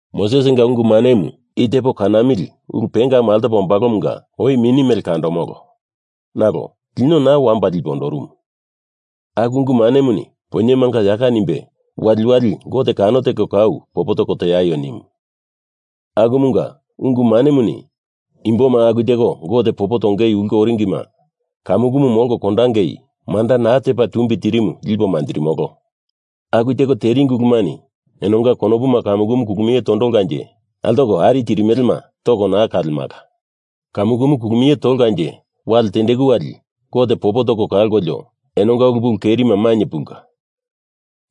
Mosesinga ungu manemu i tepo kanamili ulu pengamu altopa ombalomunga oi mini mele kandomolo. Nalo lino naa wamba lipe ondorumu. Aku ungu manemuni poinyemanga yaka nimbe wali wali Gote kano teko kau popo toko tieio nimu. Akumunga ungu manemuni imboma aku teko Gote popo tongei ulke oringima kamukumu molko kondangei manda naa tepa tumbi tirimu lipo manjirimolo. Aku teko teringi ulumani enonga konopuma kamukumu kulumie tondolkanje altoko ari tirimelema toko naa kalemala. Kamukumu kulumie tolkanje wali tendeku wali Gote popo toko kalkolio, enonga ulu pulu kerima mainye pulka,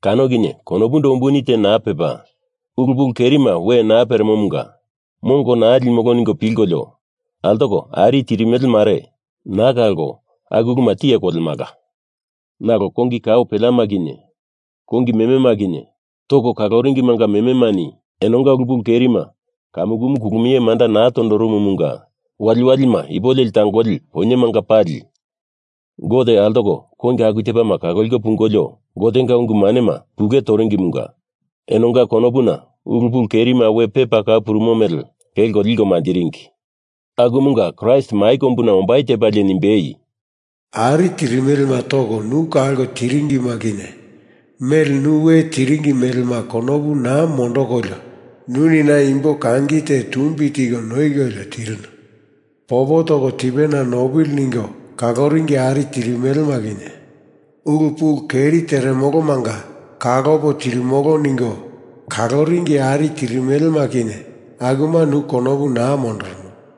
kano kinye konopundo umbuni te naa pepa, ulu pulu kerima we naa peremomunga mongo naa limolo ningo pilkolio altoko ari tirimele mare naa kalko aku uluma tiye kolemala. Nalo kongi kao peleama kinye kongi memema kinye toko kaloringimanga mememani enonga ulu pulu kerima kamukumu kulumie manda naa tondorumumunga waliwalima ipo leli tangoli poinyemanga pali Gote altoko kongi aku tepama kaloliko pungolio Gotenga ungu manema pule toringimunga enonga konopuna ulu pulu kerima we pepa kau purumu mele kelko liko manjiringi. Akumunga Kraist mai kombuna ombai tepalie nimbei, Ari tirimelema toko nu kalko tiringima kinye mele nu we tiringi melema konopu naa mondokolio nuni na imbo kangi te tumbi tiko noikolio tirinu. Popo toko tipena nopili ningo kaloringi ari tirimelema kinye, ulu pulu keri teremolomanga kalopo tirimolo ningo kaloringi ari tirimelema kinye akuma nu konopu naa mondorono.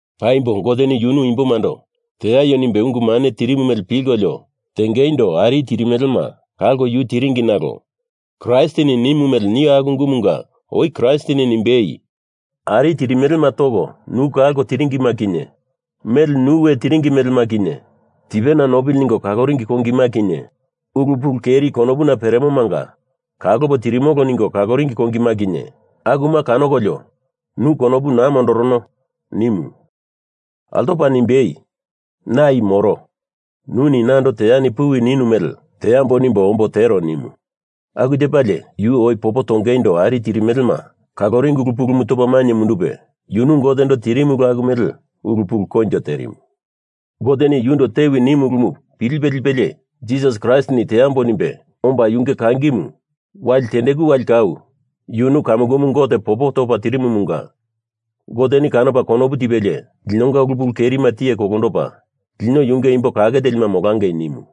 Paimbo Goteni yunu imbomando teaio nimbe ungu mane tirimu mele pilkolio tengeindo ari tirimelema kalko yu tiringi nalo Kraistini nimu mele nio aku ungumunga oi Kraistini nimbei, “Ari tirimelema toko nu kalko tiringima kinye mele nu we tiringi melema kinye tipena nopili ningo kaloringi kongima kinye ulu pulu keri konopuna peremomanga kalopo tirimolo ningo kaloringi kongima kinye, akuma kanokolio nu konopu naa mondorono,” nimu. Altopa nimbei, “Na i moro, nuni nando teani puwi ninu mele teambo nimbo omboi tero,” nimu. Aku tepalie yu oi popo tongeindo ari tirimelema kaloringi ulu pulumu topa mainye mundupe, yunu Gotendo tirimu ulu aku mele ulu pulu koinjo terimu. Goteni yundo tewi nimu ulumu pilipe lipelie Jisas Kraistini teambo nimbe omba yunge kangimu wali tendeku wali kau yunu kamukumu Gote popo topa tirimumunga Goteni kanopa konopu tipelie linonga ulu pulu kerima tiye kolondopa lino yunge imbo kake telima molangei nimu.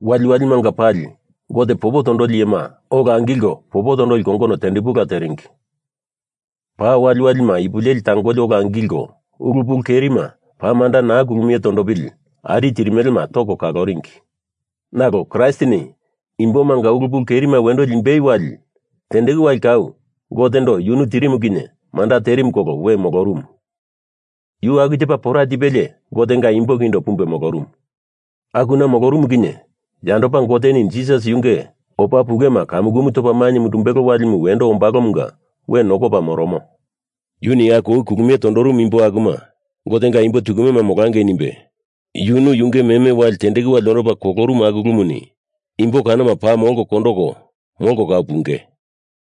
Walimanga pali Gote popo tondoli iyema ola angilko popo tondoli kongono tepundala teringi. Paa waliwalima ipuleli tangoli ola angilko ulu pulu kerima paa manda naa kulumie tondopili ari tirimelema toko kaloringi. Nalo Kraistini imbomanga ulu pulu kerima wendo limbei wali tendeku wali kau Gotendo yunu tirimu kinye manda terimu kolo we molorumu. Yu aku tepa pora tipelie Gotenga imbo kindo pumbe molorumu. Akuna molorumu kinye yandopa Goteni Jisas yunge opa pulema kamukumu topa mainye mundumbelo walimu wendo ombalomunga we nokopa moromo. Yuni aku oi kulumie tondorumu imbo akuma Gotenga imbo tukumema molangei nimbe yunu yunge meme wali tendeku wali ondopa kolorumu aku ulumuni imbo kanoma paa molko kondoko molko kau punge.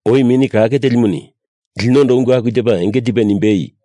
Oi Mini Kake Telimuni linondo ungu aku tepa enge tipe nimbei,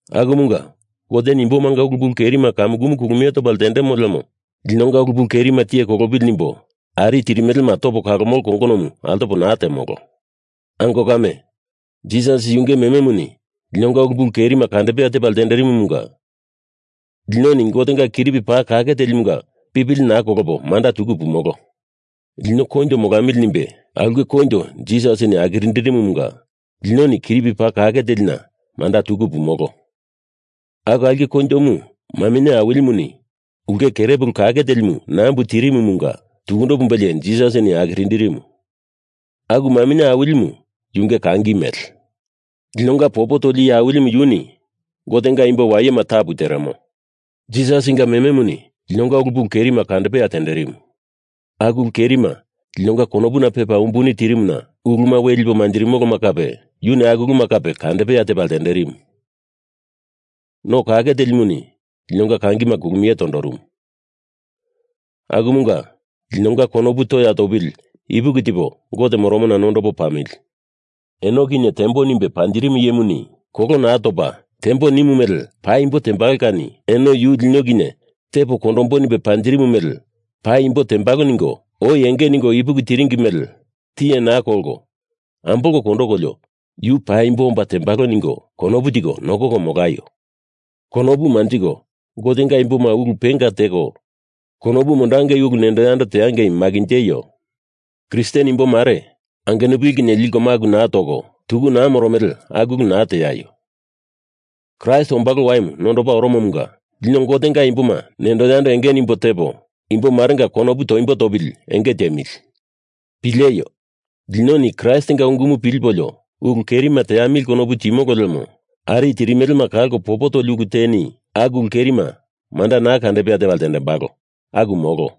Akumunga Goteni imbomanga ulu pulu kerima kamukumu kandepea tepa ltendemo lemo linonga ulu pulu kerima tiye kolopili nimbo ari tirimelema topo kalomolo kongonomu altopo naa temolo. Ango kame, Jisas yunge mememuni linonga ulu pulu kerima kandepea tepa ltenderimumunga linoni Gotenga Kiripi Paa Kake Telimunga pipili naa kolopo manda tuku pumolo. Lino koinjo molamili nimbe aulke koinjo Jisasini akiririmumunga linoni Kiripi Paa Kake Telina manda tuku pumolo. Aku aulke koinjomu maminye awilimuni ulke kerepulu kake telimu nambu tirimumunga tukundo pumbelie Jisasini akirindirimu. Aku maminye awilimu yunge kangi mele. Linonga Popo Toli Iye Awilimu yuni Gotenga imbo wayema tapu teremo. Jisasinga mememuni linonga ulu kerima kandepea tenderimu. Aku ulu kerima linonga konopuna pepa umbuni tirimuna uluma we lipo manjirimoloma yuni aku uluma kape kandepea tepa ltenderimu. No kake telimuni linonga kangima kulumie tondorumu. Akumunga linonga konopu toya topili ipuki tipo Gote moromona nondopo pamili. Eno kinye tembo nimbe panjirimu iyemuni kolo naa topa tembo nimo mele paimbo tembalo kani eno yu lino kinye tepo kondombo nimbe panjirimu mele paimbo tembalo ningo oi enge ningo ipuki tiringi mele tiye naa kolko, ambolko kondokolio yu paimbo omba tembalo ningo konopu tiko nokoko molaio. Konopu manjiko Gotenga imboma ulu penga teko konopu mondangei ulu nendo yando teangei makinjeio. Kristen imbo mare angenupili kinye liko maku naa toko tuku naa moromele aku ulu naa teaio. Kraist ombalo waimu nondopa oromomunga lino Gotenga imboma nendo yando enge nimbo tepo imbo marenga konopu toimbo topili enge tiemili. Pileio. Linoni Kraistinga ungumu pilipolio ulu kerima teamili konopu timolo lemo ari tirimelema kalko popo toli ulu teni aku ulu kerima manda naa kandepea tepa ltendembalo. Aku molo.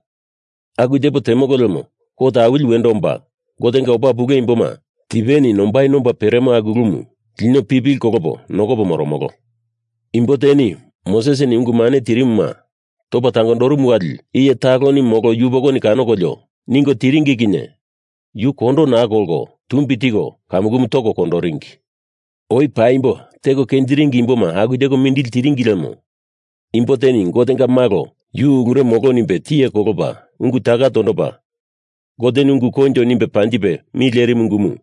Aku tepo temolo lemo kot awili wendo omba Gotenga opa pule imboma tipeni nombai nomba peremo aku ulumu lino pipili kolopo nokopo moromolo. Imbo teni Mosesini ungu mane tirimuma topa tangondorumu wali iye taloni molo yupokoni kanokolio ningo tiringi kinye yu kondo naa kolko tumbi tiko kamukumu toko kondoringi. Oi paimbo teko kenjiringi imboma aku teko mindili tiringi lemo imbo teni Gotenga Malo yu ulure molo nimbe tiye kolopa ungu taka tondopa, Goteni ungu koinjo nimbe panjipe mi lerimu ungumu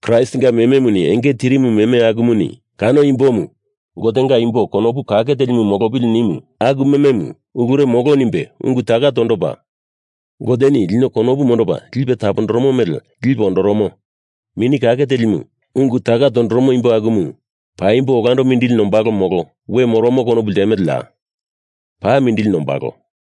Kraistinga mememuni enge tirimu meme akumuni kano imbomu Gotenga imbo konopu kake telimu molopili nimu aku mememu ulure molo nimbe ungu taka tondopa, Goteni lino konopu mondopa lipe tapondoromo mele lipe ondoromo Mini Kake Telimu ungu taka tondoromo imbo akumu paimbo olandopa mindili nombalo molo we moromo konopu ltemeleya? Paa mindili nombalo.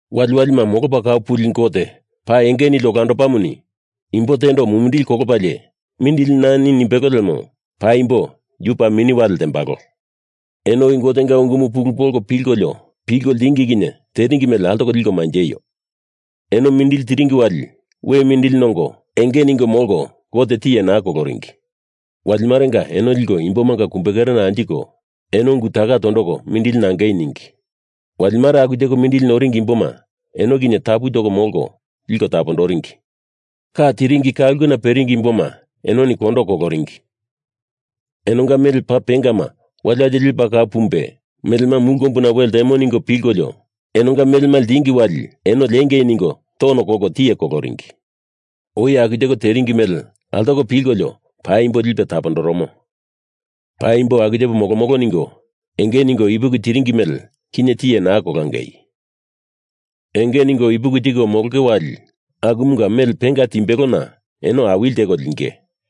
Waliwalima molopa kau puli Gote paa enge nili olandopamuni imbo tendo mumindili kolopalie mindili nani nimbelo lemo paimbo yu paa mini wale ltembalo. Eno oi Gotenga ungumu pulu polko pilkolio pilko ltingi kinye teringi mele altoko liko manjeio. Eno mindili tiringi wali we mindili nongo enge ningo molko Gote tiye naa koloringi. Wali marenga eno liko imbomanga kumbe kerena anjiko eno ungu taka tondoko mindili nangei ningi. Wali mare aku teko mindili noringi imboma eno kinye tapu toko molko liko tapondoringi. Ka tiringi ka ulkena peringi imboma enoni kondo koloringi. Enonga mele paa penga waliwalima lepa kau pumbe melema mulu kombuna we ltemo, ningo pilkolio enonga melema ltingi wali eno liengei ningo tono kolko tiye koloringi. Oi aku teko teringi mele altoko pilkolio paimbo lipe tapondoromo. Paimbo aku tepo molomolo, ningo enge ningo ipuki tiringi mele kinye tiye naa kolangei. Enge ningo ipuki tiko molonge wali akumunga mele penga timbelona eno awili teko linge.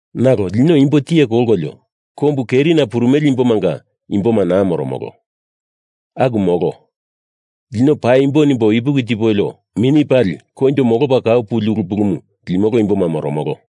Nalo lino imbo tiye kolkolio kombu kerina purumele imbomanga imboma naa moromolo. Aku molo. Lino paimbo nimbo ipuki tipolio mini pali koinjo molopa kau puli ulu pulumu limolo imboma moromolo.